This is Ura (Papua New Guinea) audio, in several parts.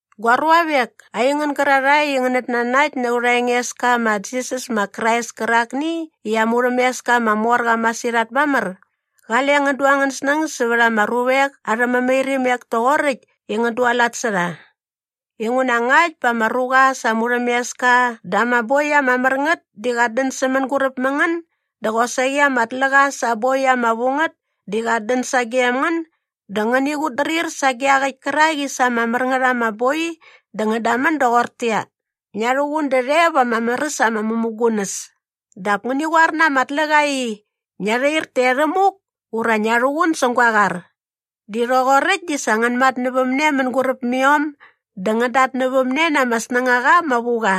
Gua ruavek, aingän gärarhae i ngänät nanakt na aurha Engeska ma Jisas ma Krais kärakni i aa murhämeska ama mor qa masirhat mamär, qale ngän du angän snäng sävät ama ruvek arhä mämairimek toqoräkt i ngän dualat sä rha. Inguna ngakt bä ama ruqa sa aa murhämeska dä ama boi ama mär ngät di qat dän sä mänguräp mä ngän dä qosaqi ama tläqa sa aa boi ama vu ngät di qat dän sagem ngän dä ngäni qutdrir sage iaqäkt kärak i sa ama mär ngät ama boi dä ngän damän doqortäqyia, “Ngia rhuqun därhe va ama mär äs ama mämugunäs” dap ngäni qoar na ama tläqa i, “Ngia rhair taerhämuk” ura “Ngia rhuqun säng gua qar” di rhoqoräkt di sa ngän matnävämne mänguräp mä iom dä ngän datnävämne na ama snängaqa ama vu qa.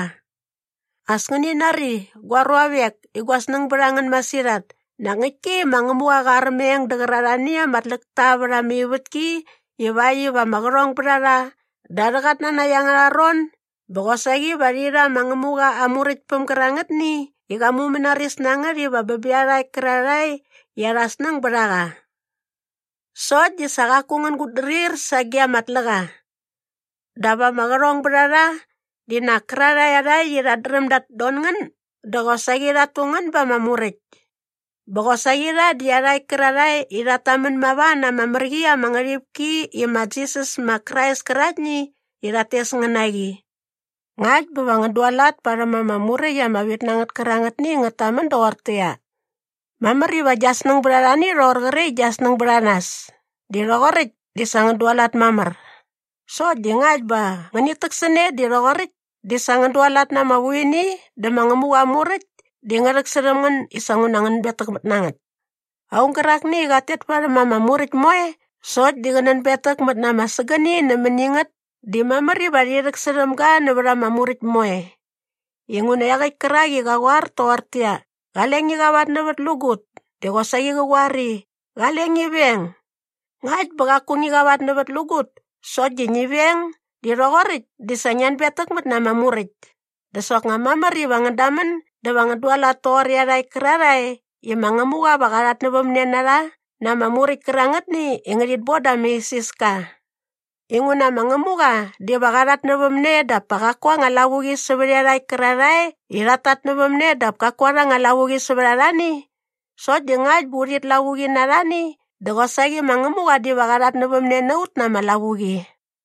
As ngäni nari, gua ruavek i gua snäng bät a ngän masirhat, nak ngäktki i ma Ngämuqa qa armeng dä qärarhani ama tläkta vät ama ivätki ivakt iva ama qärhong bät a rha da arhä qatnanakt angärha ron bä qosaqi va rhi rha ma Ngämuqa aa Muräktpäm gärangätni i qa mumänaris na ngät iva bä bä iarhakt kärarhae i arhä snäng bät a qa. Sokt di sa qaku ngän gutdrir sage ama tläqa. Dap ama qärhongbärharha di nak kärarhae iarhakt i rhat dräm dat don ngän dä qosaqi rhat tu ngän ba ama muräkt. Bä qosaqi rha di iarhakt kärarhae i rhat tamän mava na ama mär qi ama ngärhipki i ma Jisas ma Krais käraktni i rhat tes ngän na qi. Ngakt bä va ngän dualat parhäm ama muräkt ama vit na ngät kärangätni i ngät tamän doqortäqyia, “Mamär iva gia snäng bät arhani i rhoqor qre i gia snäng bät a nas” di rhoqoräkt di sa ngän dualat mamär. Sokt di ngakt bä ngänit täksäne di rhoqoräkt di sa ngän dualat na ama vuini dä ma Ngämuqa aa Muräkt di ngä rhäksärhäm ngän i sa nguna ngän betäkmät na ngät. Aung gärakni i qat tet mamär varhäm ama Muräkt moe sokt di qä nänbetäkmät na ama sägäni nämäni ngät di mamär iva rhi rhäksärhäm ga nävät ama Muräkt moe. Inguna iaqäkt kärak i qa qoar toqortäqyia, “Qale ngi qavatnävätlägut” di qosaqi qa qoar i, “Qale ngi veng.” Ngakt bä qaku ngi qavatnävätlägut sokt di ngi veng di rhoqoräkt di sa ngia anbetäkmät na ama Muräkt. Dä soknga mamär iva ngän damän dä va ngän dualat toqor iarhakt kärarhae i ma Ngämuqa va qa rhatnävämne na rha na ama muräkt kärangätni i ngärhit bon da ama isiska. Inguna ma Ngämuqa diva qa rhatnävämne dap pa qaku aa anga lavuqi sävät iarhakt kärarhae i rhat tatnävämne dap kaku arha anga lavuqi sävät arhani. Sokt di ngakt bä urhit lavuqi na arhani dä qosaqi ma Ngämuqa diva qa rhatnävämne na ut na ama lavuqi.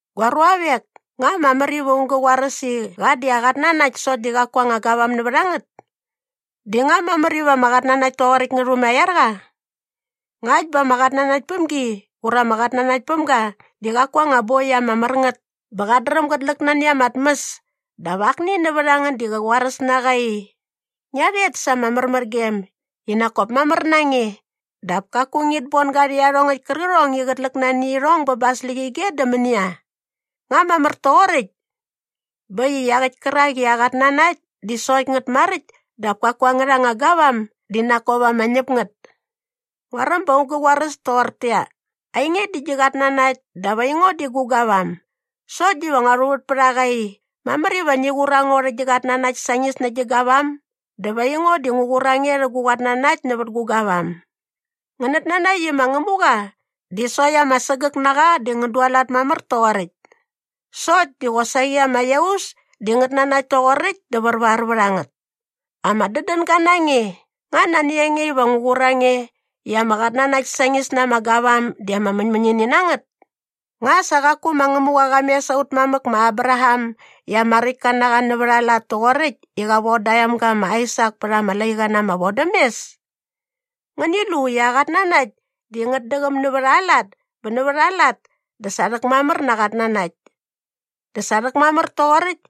Gua ruavek, nga mamär iva aung gä qoaräs i qa di aa anga qatnanakt sokt di qa di qaku aa anga gavam nävät a ngät? Di nga mamär iva ama qatnanakt toqoräkt ngä rhumaiar qa? Ngakt bä ama qatnanaktpämgi ura ama qatnanaktpämga di qaku aa anga boi ama mär ngät bä qat dräm gät läk nani ama tmäs dap akni nävät a ngän di qä qoaräs na qa i, “Ngia rhet sa ama märmärgem i nak kop mamär na nge” dap kaku ngit bon ga rhä iarhongäkt kärqärhong i qät läk nani irhong bä ba aa släqyige dä mänia? Nga mamär toqoräkt? Bä äkt i iaqäkt kärak i aa qatnanakt di sokt ngät maräkt dap kaku angärha anga gavam di ngät di nak kop ama ñäp ngät. Nguaräm bä aung gä qoaräs toqortäqyia, “Ainge di gi qatnanakt dap aingo di gu gavam.” Sokt diva ngua rhuvät pät a qa i, “Mamär iva ngi qur a ngo rhä gi qatnanakt sañis nä gi gavam dä va ngo diva ngu qur a nge rhä gu qatnanakt nävät gu gavam.” Ngänät nanakt i ma Ngämuqa di sokt ama sägäk na qa di ngän dualat mamär toqoräkt. Sokt di qosaqi ama iaus di ngät nanakt toqoräkt dä värvar vät a ngät! Ama dädänga na nge, nga nani a nge iva ngu qur a nge i ama qatnanakt sañis na ama gavam di ama mäñmäñini na ngät? Nga sa qaku ma Ngämuqa qa mes aut mamäk ma Abraham i ama räktka na qa nävät aa lat toqoräkt i qa von da aa emga ma Aisak pät ama laiqa na ama vodämes? Ngäni lu i aa qatnanakt di ngät däqäm nävät aa lat bä nävät aa lat dä sa rhäkmamär na aa qatnanakt. Dä sa rhäkmamär toqoräkt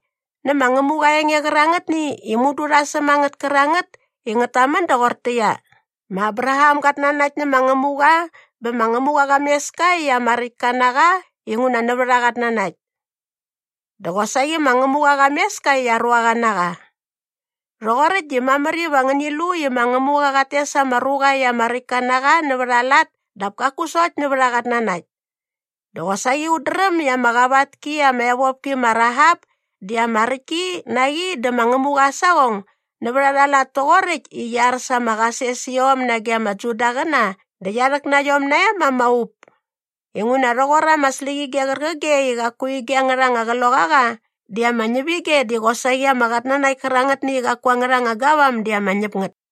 nä ma Ngämuqa aa enge qärangätni i mudu rha säm a ngät kärangät i ngät tamän doqortäqyia, “Ma Abraham gat nanakt nä ma Ngämuqa bä ma Ngämuqa qa mes ka i ama räktka na qa inguna nävät aa qatnanakt.” Dä qosaqi ma Ngämuqa qa mes ka i aa ruaqa na qa. Rhoqoräkt di mamär iva ngäni lu i ma Ngämuqa qat tes ama ruqa i ama räktka na qa nävät aa lat dap kaku sokt nävät aa qatnanakt. Dä qosaqi ut dräm i ama qavat ki ama evopki ma Rahap di qi ama räktki na qi dä ma Ngämuqa aa saqong nävät arha lat toqoräkt i qia ar sa ama qasesiom nage ama Judaqäna dä qia rhäk na iom nae ma ama up. Inguna rhoqor ama släqyige qärqige i qaku ige angät anga kloqaqa di ama ñäp ige di qosaqi ama qatnanakt kärangätni i qaku angärha anga gavam di ama ñäp ngät.